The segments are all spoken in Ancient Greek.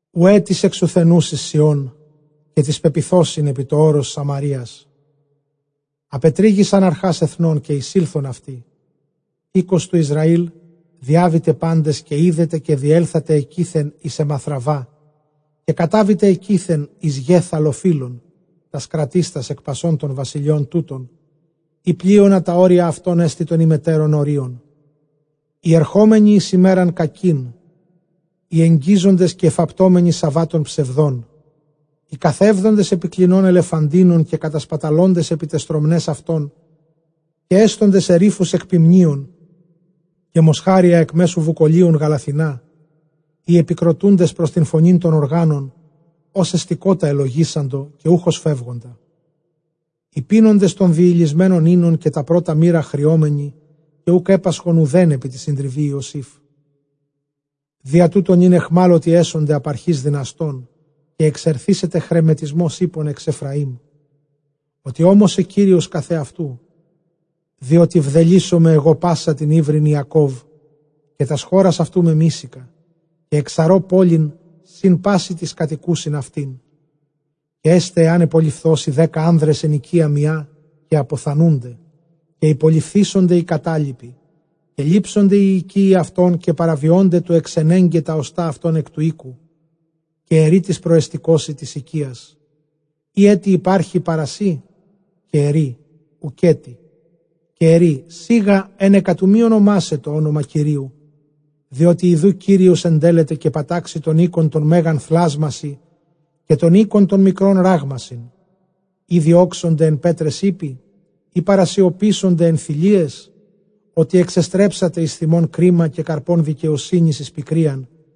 Οὐαὶ τοῖς ἐξουθενοῦσι Σιὼν, καὶ τοῖς πεποιθόσιν ἐπὶ τὸ ὄρος Σαμαρείας, ἀπετρύγησαν ἀρχὰς ἐθνῶν, καὶ εἰσῆλθον αὐτοί. οἶκος τοῦ Ἰσραὴλ διάβητε πάντες καὶ ἴδετε, καὶ διέλθατε ἐκεῖθεν εἰς Ἐματραββὰ, καὶ κατάβητε ἐκεῖθεν εἰς Γὲθ ἀλλοφύλων, τὰς κρατίστας ἐκ πασῶν τῶν βασιλειῶν τούτων, εἰ πλείονα τὰ ὅρια αὐτῶν ἐστι τῶν ὑμετέρων ὁρίων. Οἱ ἐρχόμενοι εἰς ἡμέραν κακὴν, οἱ ἐγγίζοντες καὶ ἐφαπτόμενοι σαββάτων ψευδῶν, οἱ καθεύδοντες ἐπὶ κλινῶν ἐλεφαντίνων, καὶ κατασπαταλῶντες ἐπὶ ταῖς στρωμναῖς αὐτῶν, καὶ ἔσθοντες ἐρίφους ἐκ ποιμνίων, καὶ μοσχάρια ἐκ μέσου βουκολίων γαλαθηνὰ, οἱ ἐπικροτοῦντες πρὸς τὴν φωνὴν τῶν ὀργάνων, ὡς ἑστηκότα ἐλογίσαντο, καὶ οὐχ ὡς φεύγοντα, οἱ πίνοντες τὸν διυλισμένον οἶνον, καὶ τὰ πρῶτα μῦρα χριόμενοι, καὶ οὐκ ἔπασχον οὐδὲν ἐπὶ τῇ συντριβῇ Ἰωσήφ. Διὰ τοῦτο νῦν αἰχμάλωτοι ἔσονται ἀπʼ ἀρχῆς δυναστῶν, καὶ ἐξαρθήσεται χρεμετισμὸς ἵππων ἐξ Ἐφραίμ· Ὅτι ὤμοσε Κύριος καθʼ ἑαυτοῦ, διότι βδελύσσομαι ἐγὼ πᾶσαν τὴν ὕβριν Ἰακὼβ, καὶ τὰς χώρας αὐτοῦ μεμίσηκα, καὶ ἐξαρῶ πόλιν σὺν πᾶσι τοῖς κατοικοῦσιν αὐτήν. Καὶ ἔσται, ἐὰν ὑπολειφθῶσι δέκα ἄνδρες ἐν οἰκίᾳ μιᾷ, καὶ ἀποθανοῦνται, καὶ ὑπολειφθήσονται οἱ κατάλοιποι, καὶ λήψονται οἱ οἰκεῖοι αὐτῶν, καὶ παραβιῶνται τοῦ ἐξενέγκαι τὰ ὀστᾶ αὐτῶν ἐκ τοῦ οἴκου· καὶ ἐρεῖ τοῖς προεστηκόσι τῆς οἰκίας, εἰ ἔτι ὑπάρχει παρὰ σοί; Καὶ ἐρεῖ, οὐκ ἔτι· καὶ ἐρεῖ, σίγα ἕνεκα τοῦ μὴ ὀνομάσαι τὸ ὄνομα Κυρίου. Διότι ἰδοὺ Κύριος ἐντέλλεται, καὶ πατάξει τὸν οἶκον τὸν μέγαν θλάσμασι, καὶ τὸν οἶκον τὸν μικρὸν ῥάγμασιν. Εἰ διώξονται ἐν πέτραις ἵπποι; εἰ παρασιωπήσονται ἐν θηλείαις; ὅτι ἐξεστρέψατε εἰς θυμὸν κρίμα, καὶ καρπὸν δικαιοσύνης εἰς πικρίαν,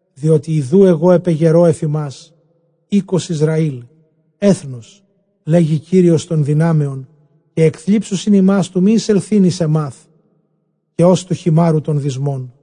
Διότι ἰδοὺ ἐγὼ ἐπεγερῶ ἐφʼ ὑμᾶς οἶκος Ἰσραὴλ ἔθνος, λέγει Κύριος τῶν δυνάμεων, καὶ ἐκθλίψουσιν ὑμᾶς τοῦ μὴ εἰσελθεῖν εἰς Αἰμὰθ, καὶ ὡς τοῦ χειμάῤῥου τῶν δυσμῶν.